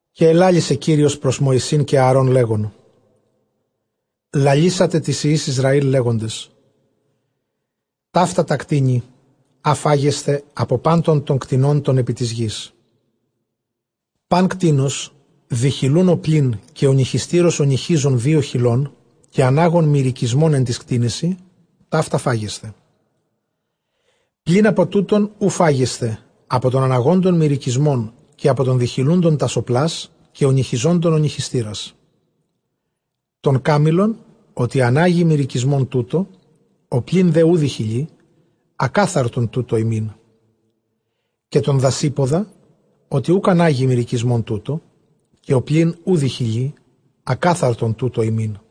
Καὶ ἐλάλησε Κύριος πρὸς Μωυσῆν καὶ Ἀαρὼν, λέγων, λαλήσατε τοῖς υἱοῖς Ἰσραὴλ, λέγοντες, ταῦτα τὰ κτήνη, ἃ φάγεσθε ἀπὸ πάντων τῶν κτηνῶν τῶν ἐπὶ τῆς γῆς. Πᾶν κτῆνος διχηλοῦν ὁπλὴν καὶ ὀνυχιστῆρας ὀνυχίζον δύο χηλῶν, καὶ ἀνάγον μηρυκισμὸν ἐν τοῖς κτήνεσι, ταῦτα φάγεσθε. Πλὴν ἀπὸ τούτων οὐ φάγεσθε, ἀπὸ τῶν ἀναγόντων μηρυκισμὸν, καὶ ἀπὸ τῶν διχηλούντων τὰς ὁπλὰς, καὶ ὀνυχιζόντων ὀνυχιστῆρας· τὸν κάμηλον, ὅτι ἀνάγει μηρυκισμὸν τοῦτο, ὁπλὴν δὲ οὐ διχηλεῖ, ἀκάθαρτον τοῦτο ὑμῖν. Καὶ τὸν δασύποδα, ὅτι ἀνάγει μηρυκισμὸν τοῦτο, καὶ ὁπλὴν οὐ διχηλεῖ, ἀκάθαρτον τοῦτο ὑμῖν.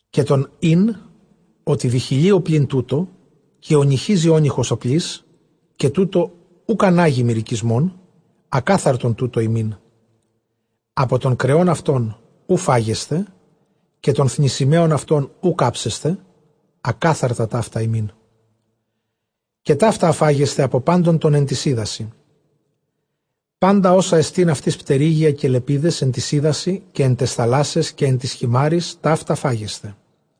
Καὶ τὸν ὗν, ὅτι διχηλεῖ ὁπλὴν τοῦτο, καὶ ὀνυχίζει ὄνυχας ὁπλῆς, καὶ τοῦτο οὐκ ἀνάγει μηρυκισμὸν, ἀκάθαρτον τοῦτο ὑμῖν. Ἀπὸ τῶν κρεῶν αὐτῶν οὐ φάγεσθε, καὶ τῶν θνησιμαίων αὐτῶν οὐχ ἅψεσθε· ἀκάθαρτα ταῦτα ὑμῖν. Καὶ ταῦτα, ἃ φάγεσθε ἀπὸ πάντων τῶν ἐν τοῖς ὕδασι· πάντα ὅσα ἐστὶν αὐτοῖς πτερύγια καὶ λεπίδες ἐν τοῖς ὕδασι, καὶ ἐν ταῖς θαλάσσαις, καὶ ἐν τοῖς χειμάῤῥοις, ταῦτα φάγεσθε.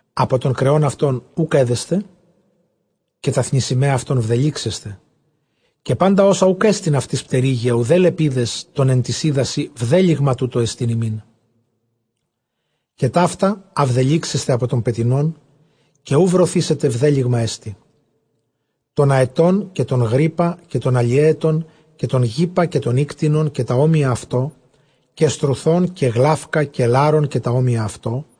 Ἀπὸ τῶν κρεῶν αὐτῶν οὐκ ἔδεσθε, καὶ τὰ θνησιμαῖα αὐτῶν βδελύξεσθε. Καὶ πάντα ὅσα οὐκ ἔστιν αὐτοῖς πτερύγια, οὐδὲ λεπίδες τῶν ἐν τοῖς ὕδασι, βδέλυγμα τοῦτό ἐστιν ὑμῖν. Καὶ ταῦτα, ἃ βδελύξεσθε ἀπὸ τῶν πετεινῶν, καὶ οὐ βρωθήσεται, βδέλυγμά ἐστι· τὸν ἀετὸν, καὶ τὸν γρύπα, καὶ τὸν ἁλιαίετον, καὶ τὸν γύπα, καὶ τὸν ἴκτινον καὶ τὰ ὅμοια αὐτῷ. Καὶ στρουθὸν, καὶ γλαῦκα, καὶ λάρον, καὶ τὰ ὅμοια αὐτῷ·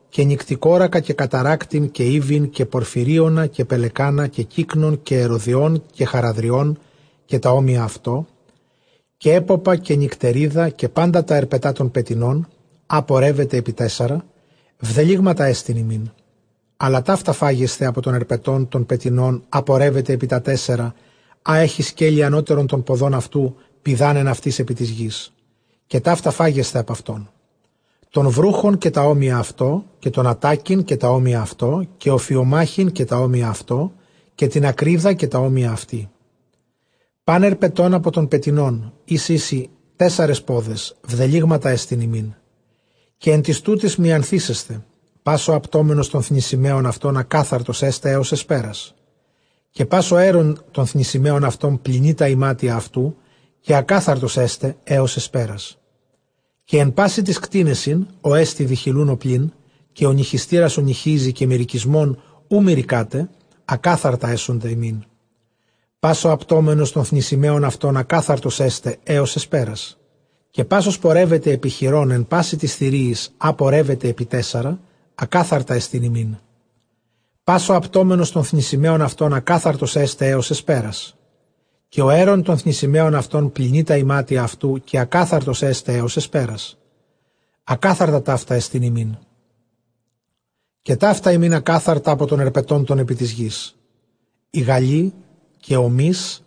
καὶ νυκτικόρακα, καὶ καταράκτην, καὶ ἴβιν, καὶ πορφυρίωνα, καὶ πελεκᾶνα, καὶ κύκνον, καὶ ἐρωδιὸν, καὶ χαράδριον, καὶ τὰ ὅμοια αὐτῷ· καὶ ἔποπα, καὶ νυκτερίδα. Καὶ πάντα τὰ ἑρπετὰ τῶν πετεινῶν, ἃ πορεύεται ἐπὶ τέσσαρα, βδελύγματά ἐστιν ὑμῖν. Ἀλλὰ ταῦτα φάγεσθε ἀπὸ τῶν ἑρπετῶν τῶν πετεινῶν, ἃ πορεύεται ἐπὶ τέσσαρα, ἃ ἔχει σκέλη ἀνώτερον τῶν ποδῶν αὐτοῦ, πηδᾷν ἐν αὐτοῖς ἐπὶ τῆς γῆς. Καὶ ταῦτα φάγεσθε ἀπʼ αὐτῶν· τὸν βροῦχον, καὶ τὰ ὅμοια αὐτῷ· καὶ τὸν ἀττάκην, καὶ τὰ ὅμοια αὐτῷ· καὶ ὀφιομάχην, καὶ τὰ ὅμοια αὐτῷ· καὶ τὴν ἀκρίδα, καὶ τὰ ὅμοια αὐτῇ· Πᾶν ἑρπετὸν ἀπὸ τῶν πετεινῶν, οἷς εἰσι τέσσαρες πόδες, βδελύγματά ἐστιν ὑμῖν, καὶ ἐν τούτοις μιανθήσεσθε· πᾶς ὁ ἁπτόμενος τῶν θνησιμαίων αὐτῶν, ἀκάθαρτος ἔσται ἕως ἑσπέρας. Καὶ πᾶς ὁ αἴρων τῶν θνησιμαίων αὐτῶν, πλυνεῖ τὰ ἱμάτια αὐτοῦ, καὶ ἀκάθαρτος ἔσται ἕως ἑσπέρας. Καὶ ἐν πᾶσι τοῖς κτήνεσιν ὅ ἐστι διχηλοῦν ὁπλὴν, καὶ ὀνυχιστῆρας ὀνυχίζει, καὶ μηρυκισμὸν οὐ μηρυκᾶται, ἀκάθαρτα ἔσονται ὑμῖν· πᾶς ὁ ἁπτόμενος τῶν θνησιμαίων αὐτῶν, ἀκάθαρτος ἔσται ἕως ἑσπέρας. Καὶ πᾶς ὃς πορεύεται ἐπὶ χειρῶν ἐν πᾶσι τοῖς θηρίοις, ἃ πορεύεται ἐπὶ τέσσαρα, ἀκάθαρτά ἐστιν ὑμῖν· πᾶς ὁ ἁπτόμενος τῶν θνησιμαίων αὐτῶν, ἀκάθαρτος ἔσται ἕως ἑσπέρας. Καὶ ὁ αἴρων τῶν θνησιμαίων αὐτῶν, πλυνεῖ τὰ ἱμάτια αὐτοῦ, καὶ ἀκάθαρτος ἔσται ἕως ἑσπέρας· ἀκάθαρτα ταῦτά ἔστιν ὑμῖν. Καὶ ταῦτα ὑμῖν ἀκάθαρτα ἀπὸ τῶν ἑρπετῶν τῶν ἐπὶ τῆς γῆς· ἡ γαλὴ, καὶ ὁ μῦς,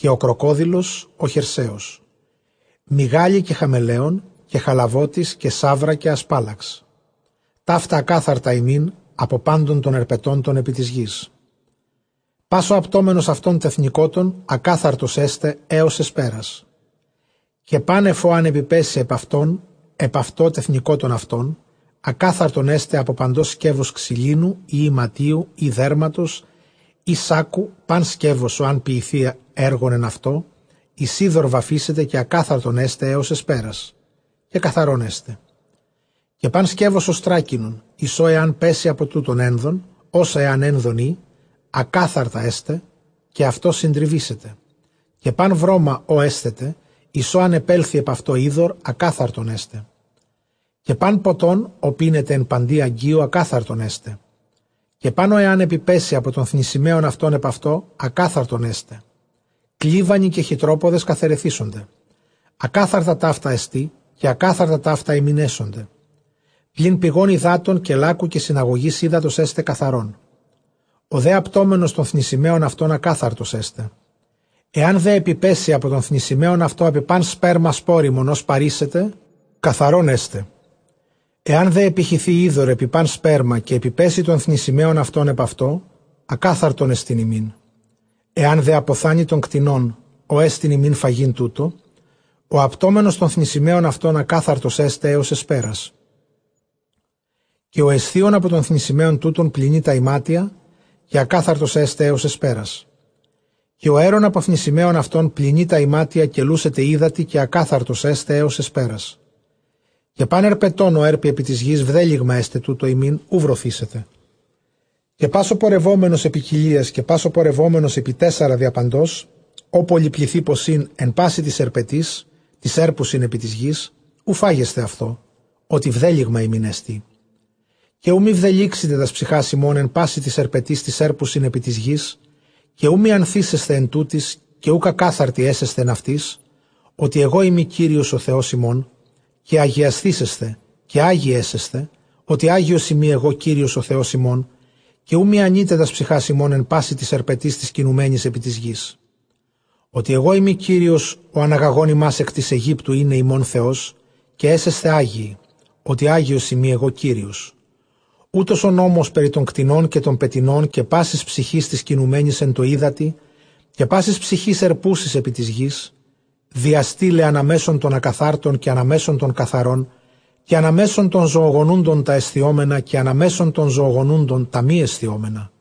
καὶ ὁ κροκόδειλος ὁ χερσαῖος, μυγάλη, καὶ χαμαιλέων, καὶ χαλαβώτης, καὶ σαῦρα, καὶ ἀσπάλαξ. Ταῦτα ἀκάθαρτα ὑμῖν ἀπὸ πάντων τῶν ἑρπετῶν τῶν ἐπὶ τῆς γῆς· πᾶς ὁ ἁπτόμενος αὐτῶν τεθνηκότων, ἀκάθαρτος ἔσται ἕως ἑσπέρας. Καὶ πᾶν ἐφʼ ὃ ἂν ἐπιπέσῃ ἀπʼ αὐτῶν ἐπʼ αὐτὸ τεθνηκότων αὐτῶν, ἀκάθαρτον ἔσται ἀπὸ παντὸς σκεύους ξυλίνου ἢ ἱματίου ἢ δέρματος ἢ σάκκου· πᾶν σκεῦος ὃ ἂν ποιηθῇ ἔργον ἐν αὐτῷ, εἰς ὕδωρ βαφήσεται, καὶ ἀκάθαρτον ἔσται ἕως ἑσπέρας· καὶ καθαρὸν ἔσται. Καὶ πᾶν σκεῦος ὀστράκινον εἰς ὃ ἐὰν πέσῃ ἀπὸ τούτων ἔνδον, ὅσα ἐὰν ἔνδον ᾖ, ἀκάθαρτα ἔσται, καὶ αὐτὸ συντριβήσεται. Καὶ πᾶν βρῶμα, ὃ ἔσθεται, εἰς ὃ ἂν ἐπέλθῃ ἐπʼ αὐτὸ ὕδωρ, ἀκάθαρτον ἔσται· καὶ πᾶν ποτὸν, ὃ πίνεται ἐν παντὶ ἀγγείῳ, ἀκάθαρτον ἔσται. Καὶ πᾶν ὃ ἐὰν ἐπιπέσῃ ἀπὸ τῶν θνησιμαίων αὐτῶν ἐπʼ αὐτό, ἀκάθαρτον ἔσται· κλίβανοι καὶ χυτρόποδες καθαιρεθήσονται· ἀκάθαρτα ταῦτά ἐστι, καὶ ἀκάθαρτα ταῦτα ὑμῖν ἔσονται. Πλὴν πηγῶν ὑδάτων καὶ λάκκου καὶ συναγωγῆς ὕδατος, ἔσται καθαρόν· ὁ δὲ ἁπτόμενος τῶν θνησιμαίων αὐτῶν, ἀκάθαρτος ἔσται. Ἐὰν δὲ ἐπιπέσῃ ἀπὸ τῶν θνησιμαίων αὐτῶν ἐπὶ πᾶν σπέρμα σπόριμον, ὃ σπαρήσεται, καθαρὸν ἔσται. Ἐὰν δὲ ἐπιχυθῇ ὕδωρ ἐπὶ πᾶν σπέρμα, καὶ ἐπιπέσῃ τῶν θνησιμαίων αὐτῶν ἐπʼ αὐτό, ἀκάθαρτόν ἐστιν ὑμῖν. Ἐὰν δὲ ἀποθάνῃ τῶν κτηνῶν, ὅ ἐστιν ὑμῖν φαγεῖν τοῦτο, ὁ ἁπτόμενος τῶν θνησιμαίων αὐτῶν, ἀκάθαρτος ἔσται ἕως ἑσπέρας· καὶ ὁ ἐσθίων ἀπὸ τῶν θνησιμαίων τούτων, πλυνεῖ τὰ ἱμάτια, καὶ ἀκάθαρτος ἔσται ἕως ἑσπέρας· καὶ ὁ αἴρων ἀπὸ θνησιμαίων αὐτῶν, πλυνεῖ τὰ ἱμάτια, καὶ λούσεται ὕδατι, καὶ ἀκάθαρτος ἔσται ἕως ἑσπέρας. Καὶ πᾶν ἑρπετὸν, ὃ ἕρπει ἐπὶ τῆς γῆς, βδέλυγμα ἔσται τοῦτο ὑμῖν· οὐ βρωθήσεται. Καὶ πᾶς ὁ πορευόμενος ἐπὶ κοιλίας, καὶ πᾶς ὁ πορευόμενος ἐπὶ τέσσαρα διαπαντός, ὃ πολυπληθεῖ ποσὶν ἐν πᾶσι τοῖς ἑρπετοῖς τοῖς ἕρπουσιν ἐπὶ τῆς γῆς, οὐ φάγεσθε αὐτὸ, ὅτι βδέλυγμα ὑμῖν ἐστι. Καὶ οὐ μὴ βδελύξητε τὰς ψυχὰς ὑμῶν ἐν πᾶσι τοῖς ἑρπετοῖς τοῖς ἕρπουσιν ἐπὶ τῆς γῆς, καὶ οὐ μιανθήσεσθε ἐν τούτοις, καὶ οὐκ ἀκάθαρτοι ἔσεσθε ἐν αὐτοῖς, ὅτι ἐγώ εἰμι Κύριος ὁ Θεὸς ὑμῶν· καὶ ἁγιασθήσεσθε, καὶ ἅγιοι ἔσεσθε, ὅτι ἅγιός εἰμι ἐγὼ Κύριος ὁ Θεὸς ὑμῶν· καὶ οὐ μιανεῖτε τὰς ψυχὰς ὑμῶν ἐν πᾶσι τοῖς ἑρπετοῖς τοῖς κινουμένοις ἐπὶ τῆς γῆς, ὅτι ἐγώ εἰμι Κύριος ὁ ἀναγαγὼν ὑμᾶς ἐκ γῆς Αἰγύπτου εἶναι ὑμῶν Θεός· καὶ ἔσεσθε ἅγιοι, ὅτι ἅγιός εἰμι ἐγὼ Κύριος. Οὗτος ὁ νόμος περὶ τῶν κτηνῶν καὶ τῶν πετεινῶν καὶ πάσης ψυχῆς τῆς κινουμένης ἐν τῷ ὕδατι, καὶ πάσης ψυχῆς ἑρπούσης ἐπὶ τῆς γῆς, διαστεῖλαι ἀναμέσον τῶν ἀκαθάρτων καὶ ἀναμέσον τῶν καθαρῶν, καὶ ἀναμέσον τῶν ζωογονούντων τὰ ἐσθιόμενα καὶ ἀναμέσον τῶν ζωογονούντων τὰ μὴ ἐσθιόμενα.